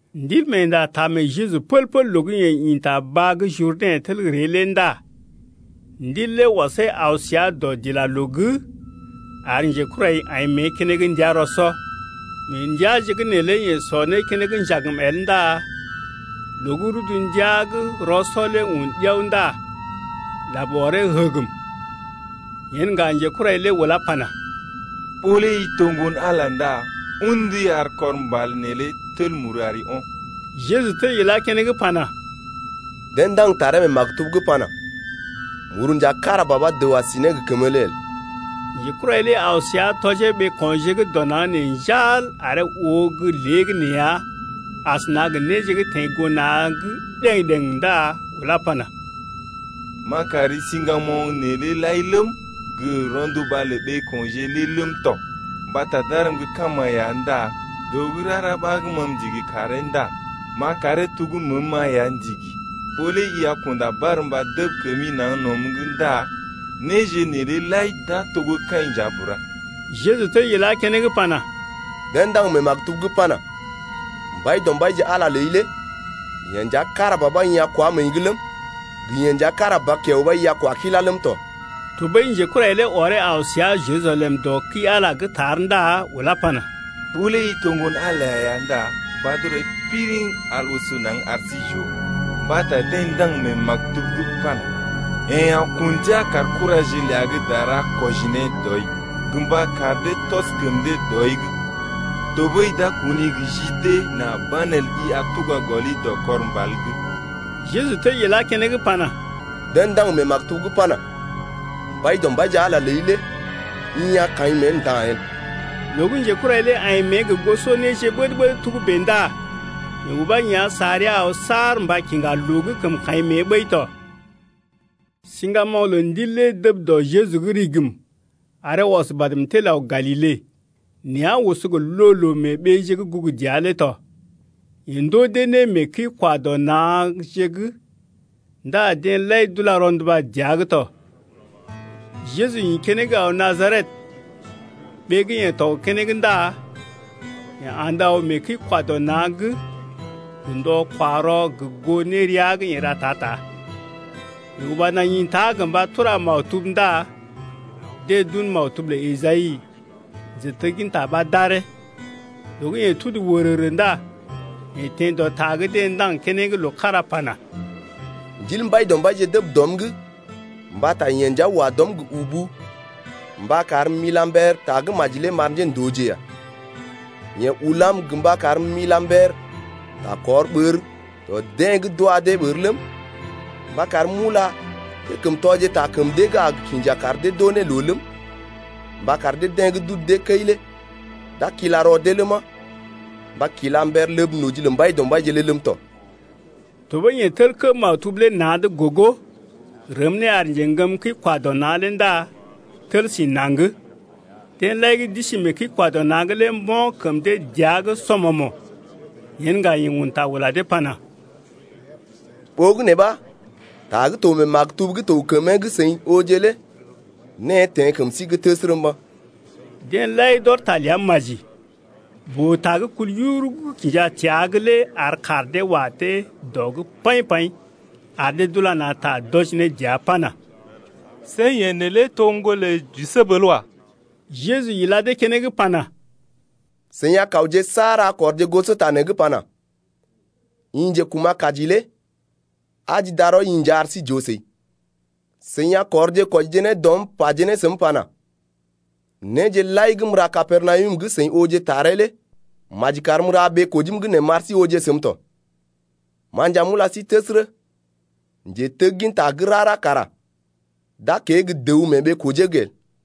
Ndilmeenda taa mee Jeju pəl-pəl loo gə́ yeḛ ḭ ta baa gə́ Jurdɛ̰ tel ree lé ndá Ndil lé ɔsee aw səa dɔdilaloo’g ar njekurai aḭ mée keneŋ ndəa rɔ-sɔ. Mee ndəaje’g neelé yeḛ sɔ né keneŋ njagm el ndá loo gə́ rudu ndəa gə́ rɔ-sɔ lé un ɗiao ndá lab ɔree həgəm, Yen ŋga njekurai lé ulá pana: Ɓó lé i to ŋgon-Ala ndá un ndui ar kɔr mbal neelé tel muru ko̰. Jeju tel ilá keneŋ pana: Deḛ ndaŋg taree mee maktub’g pana: Muru nja kára ba ɓa dəw a si ne kəmba el. Njekurai lé aw səa tɔjee ɓeeko̰je gə́ dɔ naŋg nee njal aree oo gə́ léegəneeya asəna gə néje gə́ teḛ goo na̰’g ɗəŋ-ɗeŋ ndá ulá pana: M’a kari siŋgamoŋ neelé lai ləm, gə rɔnduba lə ɓeeko̰je lé ləm tɔ, mbata d’arm gə́ kama ya ndá dəw gə́ rara ɓa ma m’ndigi karee ndá m’a karee to gə́ məəm-ma ya ndigi. Ɓó lé i a kunda barmba dəb kəmi naŋg nɔm’g ndá néje neelé lai d’a to gə́ kaḭ nja bura. Jeju tel ilá keneŋ pana: Deḛ ndaŋg mee maktub’g pana: Mbaidɔmbaije Ala ləi lé yeḛ ya kára ba ɓa i a kunda barmba nea̰’g ləm, gə yeḛ nja kára ba kiao ɓa i a ra né karee ləm tɔ. Tɔɓəi njekurai lé ɔree aw səa Jerusalem dɔ kəi-Ala’g tar ndá ulá pana: Ɓó lé i to Ŋgon-Ala ya ndá mbad rɔi piriŋ al oso naŋg ar sí j’oo: mbata deḛ ndaŋg mee maktub’g pana: Yeḛ a kun ndia kar kuraje ləa gə́ dara kwɔji ne dɔi gə mba kar dee tɔs kəm dee dɔi’g 1tɔɓəi d’a kuni gə ji dee nà banelə i a tuga gɔli dɔ kɔr mbal’g. Jeju tel ilá keneŋ pana: Deḛ ndaŋg mee maktub’g pana: Mbaidɔmbaije, Ala ləi lé i a kaḭ mée nda̰ el. Loo gə́ njekurai lé aḭ mée gə goso néje ɓəd-ɓəd togə́bè ndá yeḛ ubá yá̰ sa rəa aw saar mba kiŋga loo gə́ kəm kaḭ mée ɓəi tɔ. Siŋgamoŋ lə Ndil lé dəb dɔ Jeju’g rigim aree ɔs badm tel aw Galile, nea̰ oso gə loo-loo mee ɓeeje gə́ gugu dəa lé tɔ. Yeḛ ndoo dee né mee kəi-kwa-dɔ-na̰je’g ndá deḛ lai d’ula rɔnduba dəa’g tɔ. Jeju ḭ keneŋ aw Najaret, ɓee gə́ yeḛ tɔg keneŋ ndá yeḛ andə aw mee kəi-kwa-dɔ-na̰’g gə ndɔ-kwa-rɔ gə goo nérea gə́ yeḛ ra ta-ta. Yeḛ uba naŋg ḭta gə mba tura maktub ndá deḛ d’un maktub lə Esai, njetegginta ɓa d’aree. Loo gə́ yeḛ tudu wərərə ndá yeḛ teḛ dɔ ta gə́ deḛ ndaŋg keneŋ loo kára pana: Ndil Mbaidɔmbaije dəb dɔm’g Mbata yeḛ nja wa dɔm gə ubu Mba karm m’ila mber tagə́maji lé m’ar njéndooje ya. Yeḛ ulam gə mba karm m’ila mber ta kɔr ɓər dɔ deḛ gə́ d’wa dee ɓər ləm, Mba karm m’ula njékəmtɔje ta kəm deḛ gə́ a gə kinja kar dee d’oo ne loo ləm, Mba kar deḛ gə́ d’udu dee kəi lé d’a kila rɔ dee ləma, Mba kila mber ləb noji lə Mbaidɔmbaije lé ləm tɔ. Tɔɓəi yeḛ tel kə́ maktub lé na̰’d gogo, rəm ne ar njeŋgəm kəi-kwa-dɔ-na̰ lé ndá tel sí naŋg. Deḛ lai gə́ d’isi mee kəi-kwa-dɔ-na̰’g lé mbo̰ kəm dee dəa’g sɔmɔmo̰. Yen ŋga yeḛ un ta ula dee pana: Ɓogənè ɓa ta gə́ to mee maktub gə́ to gə kəmee gə́ seḭ ooje lé née teḛ kəm sí’g təsərə mba̰. Deḛ lai d’ɔr ta ləa maji, boo-ta gə́ kul yururu gə́ kinja təa’g lé ar kaar dee wa dee dɔ’g paḭ-paḭ ar dee d’ula na̰ ta d’wɔji ne dəa pana: See yeḛ neelé to gə́ ŋgolə Jisəb el wa. Jeju ila dee keneŋ pana: Seḭ a kawje saar a kɔrje gosota nee gə́ pana: I njekuma̰-kaji lé aji darɔi-i nja ar sí j’oo səi. Seḭ a kɔrje kwɔjije ne dɔm paje ne səm pana: Néje lai gə́ m’ra Kapernawum gə́ seḭ ooje taree lé maji karm m’ra mee ɓee-kojim’g nee m’ar sí ooje səm tɔ. Ma nja m’ula sí təsərə, njetegginta gə́ rara kara d’a kée gə́ dəw mee ɓee-kojee’g el.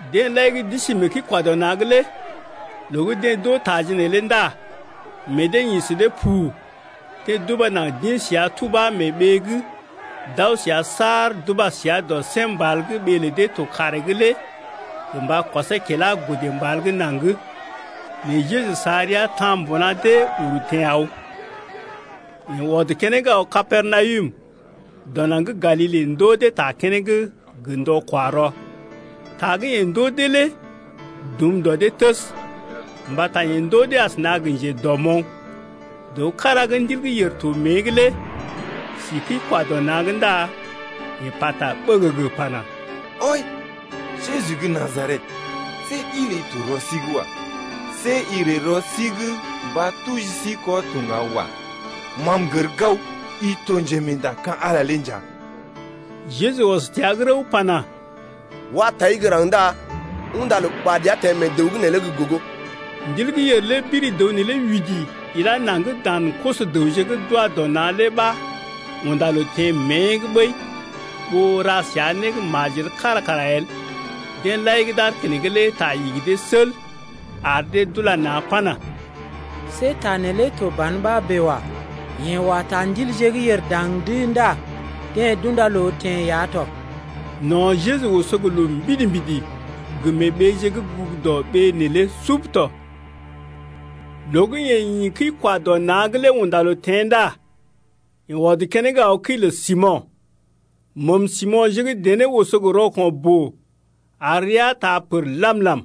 Deḛ lai gə́ d’isi mee kəi-kwa-dɔ-na̰’g lé loo gə́ deḛ d’oo taje neelé ndá meḛ dee ḭ sə dee pu. Deḛ d’uba naŋg d’ḭ səa tubá mee ɓee’g d’aw səa saar d’uba səa dɔ sém mbal gə́ ɓee lə dee to kaaree’g lé gə mba kɔsee kilá godə mbal gə́ naŋg. Nɛ Jeju sa rəa ta̰ mbuna dee uru teḛ aw. Yeḛ ɔd keneŋ aw Kapernawum dɔ naŋg gə́ Galile ndoo dee ta keneŋ gə ndɔ-kwa-rɔ. Ta gə́ yeḛ ndoo dee lé dum dɔ dee təs, mbata yeḛ ndoo dee asəna gə njedɔmoŋ. Dəw kára gə́ ndil gə́ yèr to mée’g lé si kəi-kwa-dɔ-na̰’g ndá yeḛ pata ɓəgəgə pana: Wai, Jeju gə́ Najaret! See ɗi ləi to rɔ sí’g wa. See i ree rɔ sí’g mba tuji sí kɔ to ŋga wa. Ma m’gər gao, i to Njemeenda ka̰ Ala lé nja. Jeju ɔs təa’g rəw pana: Wa tai gə́ raŋg ndá unda loo ɓad ya teḛ mee dəw’g neelé gə́ gogo. Ndil gə́ yèr lé biri dəw neelé widi ilá naŋg dan koso-dəwje gə́ d’wa dɔ na̰ lé ɓa unda loo teḛ mée’g ɓəi ɓó ra səa né gə́ majel kára kara el. Deḛ lai gə́ d’aar keneŋ lé ta igi dee sel ar dee d’ula na̰ pana: See ta neelé to ban ɓa bèe wa. Yeḛ wa ta ndilje gə́ yèr daŋ’d ndá deḛ d’unda loo teḛ ya tɔ. No̰ Jeju oso gə loo mbidi-mbidi gə mee ɓeeje gə́ gugu dɔ ɓee neelé sub tɔ. Loo gə́ yeḛ ḭ kəi-kwa-dɔ-na̰’g lé unda loo teḛ ndá yeḛ ɔd keneŋ aw kəi lə Simo̰. Məm Simo̰je gə́ dené oso gə rɔko̰ boo ar rəa taa pər lam-lam,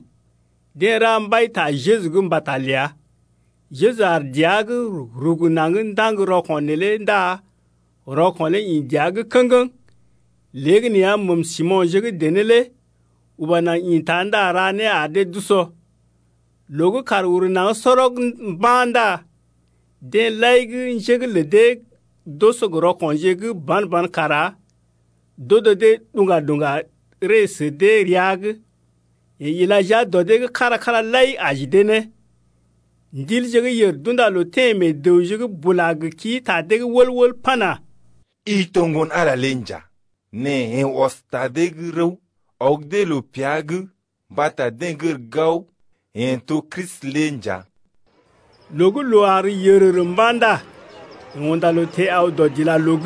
deḛ ra mbai ta Jeju’g mbata ləa. Jeju aar dəa’g, rugu naŋg ndaŋg rɔko̰ neelé ndá rɔko̰ lé ḭ dəa’g kə̰geŋ. Léegəneeya məəm Simo̰je gə́ dené lé uba naŋg ḭta ndá ra né ar dee d’usɔ. Loo gə́ kàr uru naŋg sɔrɔg mba̰ ndá deḛ lai gə́ njé’g lə dee d’oso gə rɔko̰je gə́ ban-ban kara d’odo dee ɗṵga-ɗṵga ree sə dee rəa’g. Yeḛ ila jia dɔ dee’g kára-kára lai aji dee ne. Ndilje gə́ yèr d’unda loo teḛ meḛ dəwje’g bula gə kii ta dee’g wəl-wəl pana: I to Ŋgon-Ala lé nja. Nɛ yeḛ ɔs ta dee’g rəw, ɔg dee loo pea’g mbata deḛ gər gao yeḛ to Kristi lé nja. Loo gə́ loo àr yərərə mba̰ ndá yeḛ unda loo teḛ aw dɔdilaloo’g.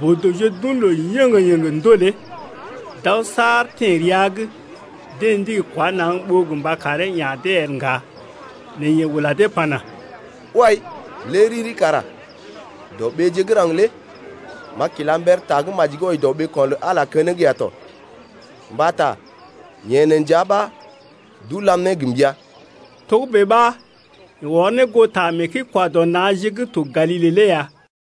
Boo-dəwje d’un loo yéŋgé-yéŋgé ndolee, d’aw saar teḛ rəa’g, deḛ ndigi kwá naŋg ɓó gə mba karee ya̰ dee el ŋga. Nɛ yeḛ ula dee pana: Wai, lé riri kara dɔ ɓeeje gə́ raŋg lé m’a kila mber tagə́maji gə́ wɔji dɔ ɓeeko̰ lə Ala keneŋ ya tɔ, mbata yeḛ nee nja ɓa d’ulam ne gə mbəa. Togə́bè ɓa yeḛ ɔr ne goo ta mee kəi-kwa-dɔ-na̰je gə́ to Galile lé ya.